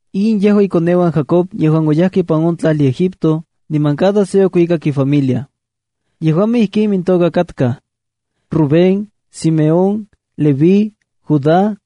In yejua ikoneuan Jacob yejuan oyajkej ipan on tlajli Egipto, niman cada se okuikak ifamilia. Yejuamej ijkin imintoka katkaj: Rubén, Simeón, Leví, Judá,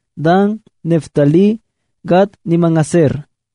Dan, Neftalí, Gad niman Aser.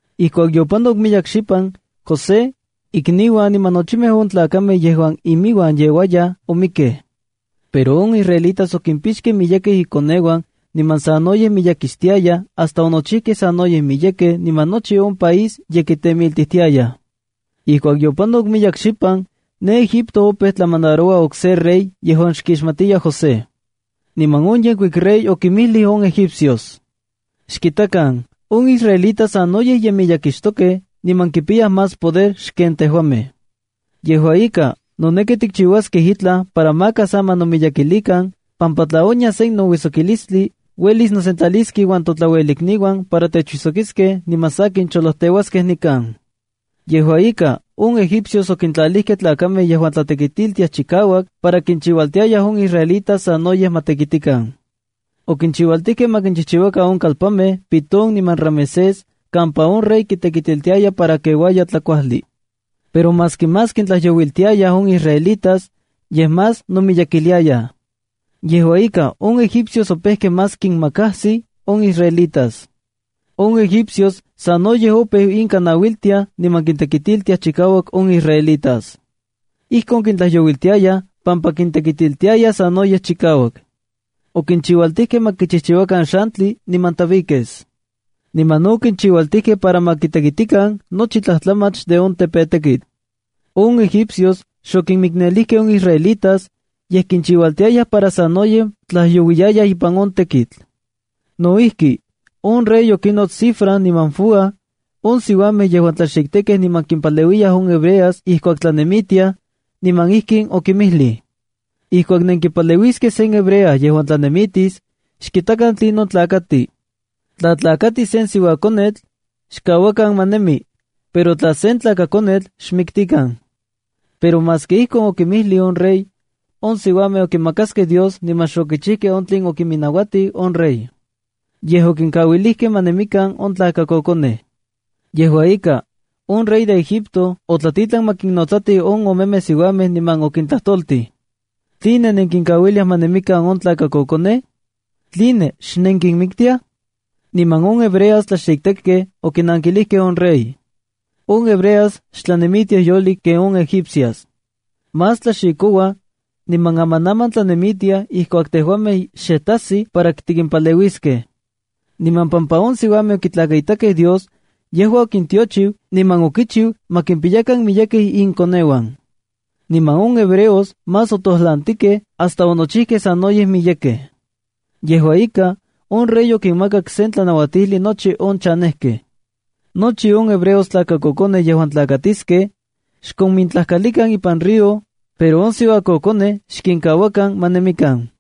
Ijkuak yopanok miyek xipan, José, ikniuan niman nochimej on tlakamej yejuan imiuan yeuayaj omikej. Pero on israelitas okimpixkej miyekej inkoneuan niman sanoyej miyekixtiayaj hasta onochijkej sanoyej miyekej niman nochi on país ye kitemiltijtiayaj. Ijkuak yopanok miyek xipan, ne egipto opeu tlamandaroua okse rey yejuan xkixmatiya José. Niman on yenkuik rey okinmijlij on egipcios: “Xkitakan, on israelitas sanoyej ye miyekixtokej niman kipiyaj más poder xken tejuamej. Yejua ika, noneki tikchiuaskej itlaj para maka sa ma nomiyekilikan, pampa tla onyas sen nouijsokilistli, uelis nosentlaliskej inuan totlauelikniuan para techuijsokiskej niman sakin cholojteuaskej nikan.” Yejua ika, on egipcios okintlalijkej tlakamej yejuan tlatekitiltiaj chikauak para kinchiualtiayaj on israelitas sanoyej ma tekitikan. Okinchiualtijkej ma kinchijchiuakan on kalpanmej Pitón niman Ramesés kampa on rey kitekitiltiaya para keuaya tlakuajli. Pero maski más kintlajyouiltiayaj on israelitas, yej más nomiyekiliayaj. Yejua ika, on egipcios opejkej más kinmakajsij on Israelitas. On egipcios sanoyej opeu inka nauiltiaj niman kintekitiltia chikauak on israelitas. Ijkon kintlajyouiltiayaj pampa kintekitiltiayaj sanoyej chikauak. Okinchiualtijkej ma kichijchiuakan xantli niman tabiques. Niman no okinchiualtijkej para ma kitekitikan nochi tlajtlamach de on tepetekitl. On egipcios xokinmiknelijkej on Israelitas, yej kinchiualtiayaj para sanoyej tlajyouiyayaj ipan on tekitl. No ijki, on rey okinots Sifra niman Fúa, on siuamej yejuan tlaxiktekkej niman kimpaleuiyayaj on hebreas ijkuak tlanemitiayaj, niman ijkin okinmijlij: —Ijkuak nenkipaleuiskej sen hebrea yejuan tlanemitis, xkitakan tlinon tlakati. Tla tlakati sen siuakonetl, xkauakan ma nemi, pero tla sen tlakakonetl, ¡xmiktikan! Pero maski ijkon okinmijlij on rey, on siuamej okimakaskej Dios niman xokichijkej on tlen okiminauatij on rey. Yej okinkauilijkej ma nemikan on tlakakokonej. Yejua ika, on rey de Egipto otlatitlan ma kinnotsatij on omemej siuamej niman okintlajtoltij: —¿Tline nenkinkauiliaj ma nemikan on tlakakokonej? ¿Tline xnenkinmiktiaj? Niman on hebreas tlaxiktekkej okinankilijkej on rey: —On hebreas xtlanemitiaj yolik ken on egipcias. Más tlaxikouaj, niman amanaman tlanemitiaj ijkuak tejuamej xe tajsij para tikimpaleuiskej. Niman pampa on siuamej okitlakaitakej Dios, yejua okintiochiu niman okichiu ma kimpiyakan miyekej inkoneuan. Niman on hebreos más otojlantikej hasta onochijkej sanoyej miyekej. Yejua ika, on rey okinmakak sen tlanauatijli nochi on chanejkej: “Nochi on hebreos tlakakokonej yejuan tlakatiskej, xkomintlajkalikan ipan río, pero on siuakokonej xkinkauakan ma nemikan.”